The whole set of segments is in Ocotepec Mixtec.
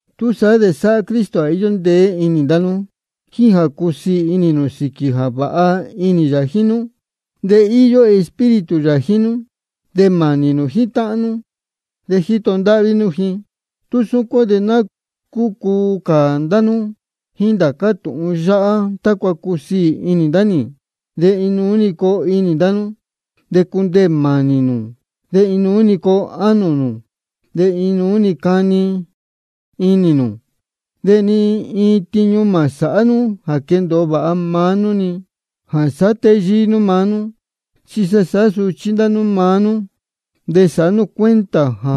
Túsaá de sáhá Cristo jā íyó ndeé inī ndá nú, jíín jā cúsiī inī nū sīquī jā vāha inī yā jíín nú. De íyó Espíritu yā jíín nú, de mānī nū jíín táhán nú, de jíto ndáhví nú ji. Tú súcuán de ná cúcuu cā ndá nú jíín ndācá tūhun yáhá, tácua cusiī ndasí inī ni. De inuú-ni coo inī ndá nú, de cundeē mānī nū, de inuú-ni coo ánō nū, de inuú cani inī nū. De ni iin tiñu mā sāhá nú jā quendōo vāha maá nú-ni, ni jā sāhá téyíí nú maá nú. Chi sa sāhá suchí ndá nú maá nú, de sāhá nú cuenta jā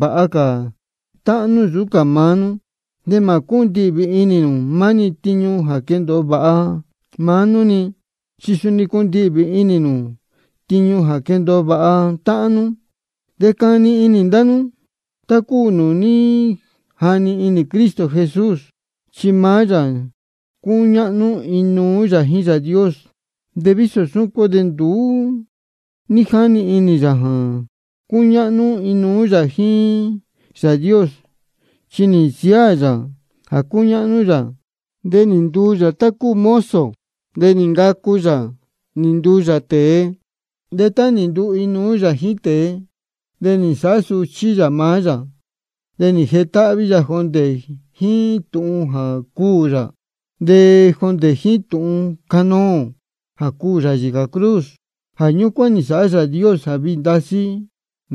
vāha cā táhán nú nsūú cā maá nú. De mā cúndihvī inī nū maá-ni tiñu jā quendōo vāha maá nú-ni, chi suni cundihvī inī nū tiñu jā quendōo vāha táhán nú. De cani inī ndá nú tá cúu nūū ní jani inī Cristo Jesús. Chi maá yā cúñáhnú inuú yā jíín Yāā Dios, de vísō súcuán de nduú ní jáni inī yā jā cuñáhnú inuú yā jíín Yāā Dios. Chi nī nsiáā yā jā cúñáhnú yā, de nī nduu yā tá cúu mozo, de nī ncacu yā nī nduu yā tēe. De tá nī nduu inuú yā jíín tēe, de nī nsāhá suchí yā maá yā. De nī jetáhví yā jondē jíín tūhun jā cuū yā, de jondē jíín tūhun canoō jā cuū yā yīcā cruz. Jā ñúcuán nī nsāhá Yāā Dios jā viī ndasí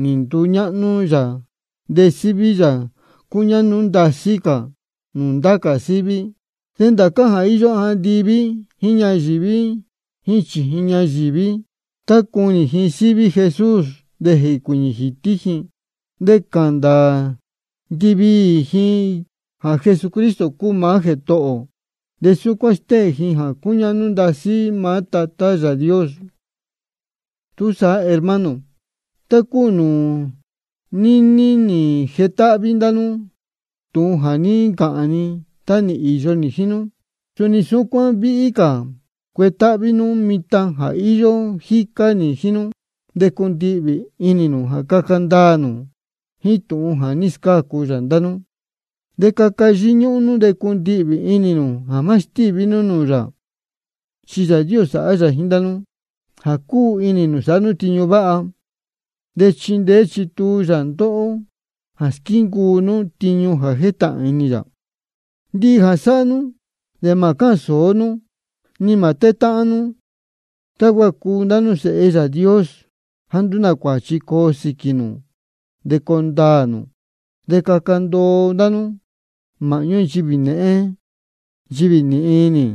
nī nduñáhnú yā, de síví yā cúñáhnú ndasí cā nūū ndá cā síví. De ndācá jā íyó andiví jíín ñayīví jíín chījin ñayīví, tá cuni ji síví Jesús de jēcuīñī jītí ji. De cāhān ndāā ndiviī ji jā Jesucristo cúu maá Jētohō ō. De súcuán stéhēn ji jā cúñáhnú ndasí maá Tatá yā Yāā Dios. Túsaá hermano, tá cúu jā níní nī jetáhví ndá nú tūhun jā ní ncāhān ni tá nī īyo nī jíín nú, suni súcuán víhí cā cuetáhví nú mitan jā íyó jícá nī jíín nú. De cundihvī inī nū jā caca ndaā nū jíín tūhun jā ní scácu yā ndá nú, de caca yíñúhún nú de cundihvī inī nū jā má stíví nú nūū yā. Chi Yāā Dios sáhá yā jíín ndá nú jā cúu inī nū sāhá nú tiñu váha, de chíndeé chítuu yā ndóhó jā squíncuu nú tiñu jétahān inī yā. Ndihi jā sáhá nú, de mā cáhān sōó nú, ni mā tétáhán nú, tácua cuu ndá nú sēhe Yāā Dios jāá nduú nā cuāchi coo sīquī nū de coo ndaā nū. De caca ndoo ndá nú māhñú nchivī nēhén nchivī nīhin inī.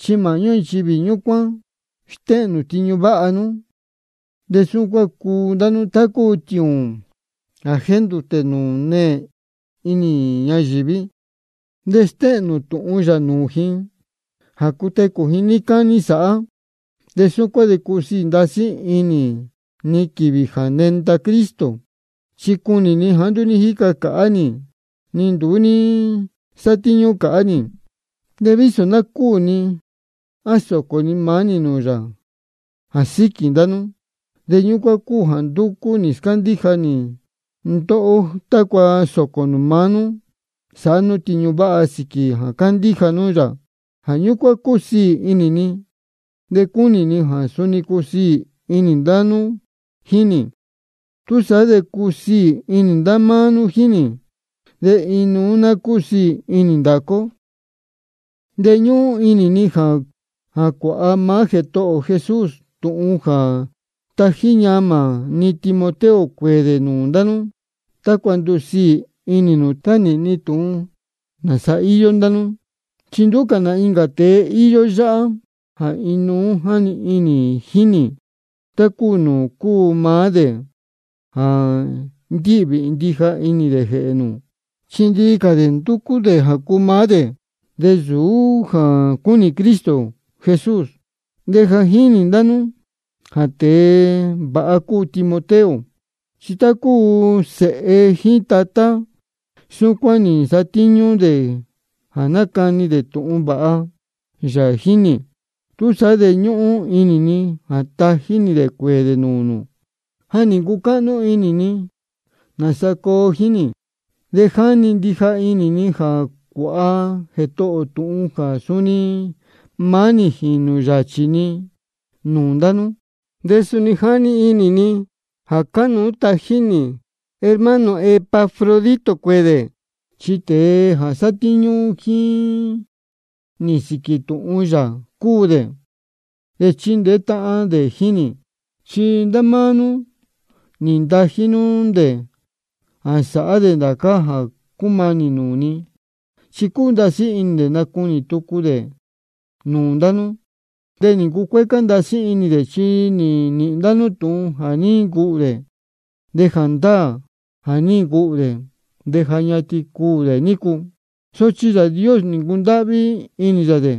Chi māhñú nchivī ñúcuán stéhēn nū tiñu váha nú, de súcuán cuu ndá nú tá cúu tiūūn jā jéndūtē nūū neē inī ñayīví. De stéhēn nū tūhun yā nūū ji jā cutecū ji níí cání sāhá. De súcuán de cusiī ndasí inī ni quīvī jā nenda Cristo, chi cunī ni jāá nduú ní jíca cāhá nī, ni nduú ní nsátíñú cāhá nī. De vísō ná cúū ni jā sōcō ni maá nī nūū yā jā síquī ndá nú, de ñúcuán cúu jā ndúcú nī scándíja cā ni ndóhó, tácua sōcō nū maá nú sāhá nú tiñu váha sīquī jā cándíja nú yā. Jā ñúcuán cúsiī inī ni, de cúnī ni jā suni cusiī inī ndá nú jíín nī. Túsaá de cusiī inī ndá máá nú jíín nī, de inuú ná cúsiī inī ndācá ó. De ñúhún inī ni jā cuāha maá Jētohō ō Jesús tūhun jā tají ñamā ni Timoteo cuēē dē nūū ndá nú, tácua ndusiī inī ni tá nīhīn ni tūhun nāsa íyó ndá nú. Chi nduú cā nā incā tēe íyó yáhá jā inuú jáni inī jíín nī, tá cúu nūū cúu maá dē jā ndíhvī ndija inī dē jēhē nū. Chi ndihi cā dē ndúcú dē jā cuu maá dē, de nsūú jā cúnī Cristo Jesús. De ja jínī ndá nú jā tēe vāha cúu Timoteo. Chi tá cúu sēhe jíín tatá, súcuán nī nsatíñú dē jā nácani dē tūhun vāha yā jíín nī. Túsaá de ñúhún inī ni jā tají nī dē cuēē dē nūū nū, tá ja nī ncucáhnú inī ni nāsa coo jíín nī. De jáni ndija inī ni jā cuāha Jētohō ō tūhun jā suni maá nī jīnū yāchī ni nūū ndá nú. De suni jáni inī ni jā cánuú tají nī hermano ō Epafrodito cuēē dē, chi tēe jā sátíñú jíín nī sīquī tūhun yā cúu dē, de chíndeé táhán dē jíín nī. Chi ndá máá nú nī ntají nú dē jā sāhá dē ndācá jā cúmanī nūū ni. Chi cúu ndasí inī dē nacunī tucu dē nūū ndá nú. De nī ncucuécá ndasí inī dē, chi nī nīhīn ndá nú tūhun jā ní ncuhū dē. De jāndáā jā ní ncuhū dē, de ja ñatin cuū dē nícu. Sochi Yāā Dios nī ncundáhví inī yā dē,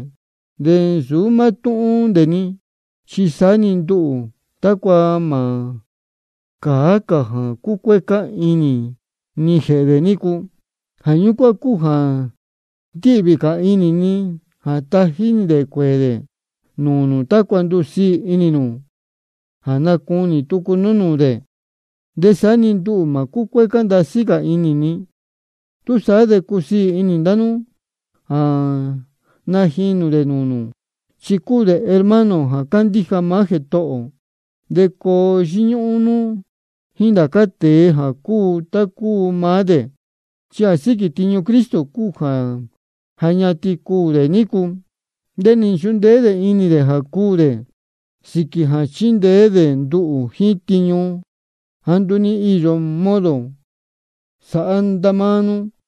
de nsūú mátúhún dē-ni, chi saá-ni nduhū, tácua mā cāá cā jā cucuécá inī ni jēhē dē nícu. Jā ñúcuán cúu jā ndíhvī cā inī ni jā tají nī dē cuēē dē nūū nū, tácua ndusiī inī nū jā nacunī tucu nú nūū dē. De saá-ni nduhū mā cúcuécá ndasí cā inī ni. Túsaá de cusiī inī ndá nú jā najinū dē nūū nū, chi cúu dē hermano ō jā cándíja maá Jētohō ō. De coo yíñúhún nú jíín ndācá tēe jā cúu tá nūū cúu maá dē. Chi jā síquī tiñu Cristo cúu jā ja ñatin cuū dē nícu. Chi nī nchundeé inī dē jā cuū dē sīquī jā chindeé dē nduhū jíín tiñu jāá nduú ní íyo modo sāhá ndá máá nú.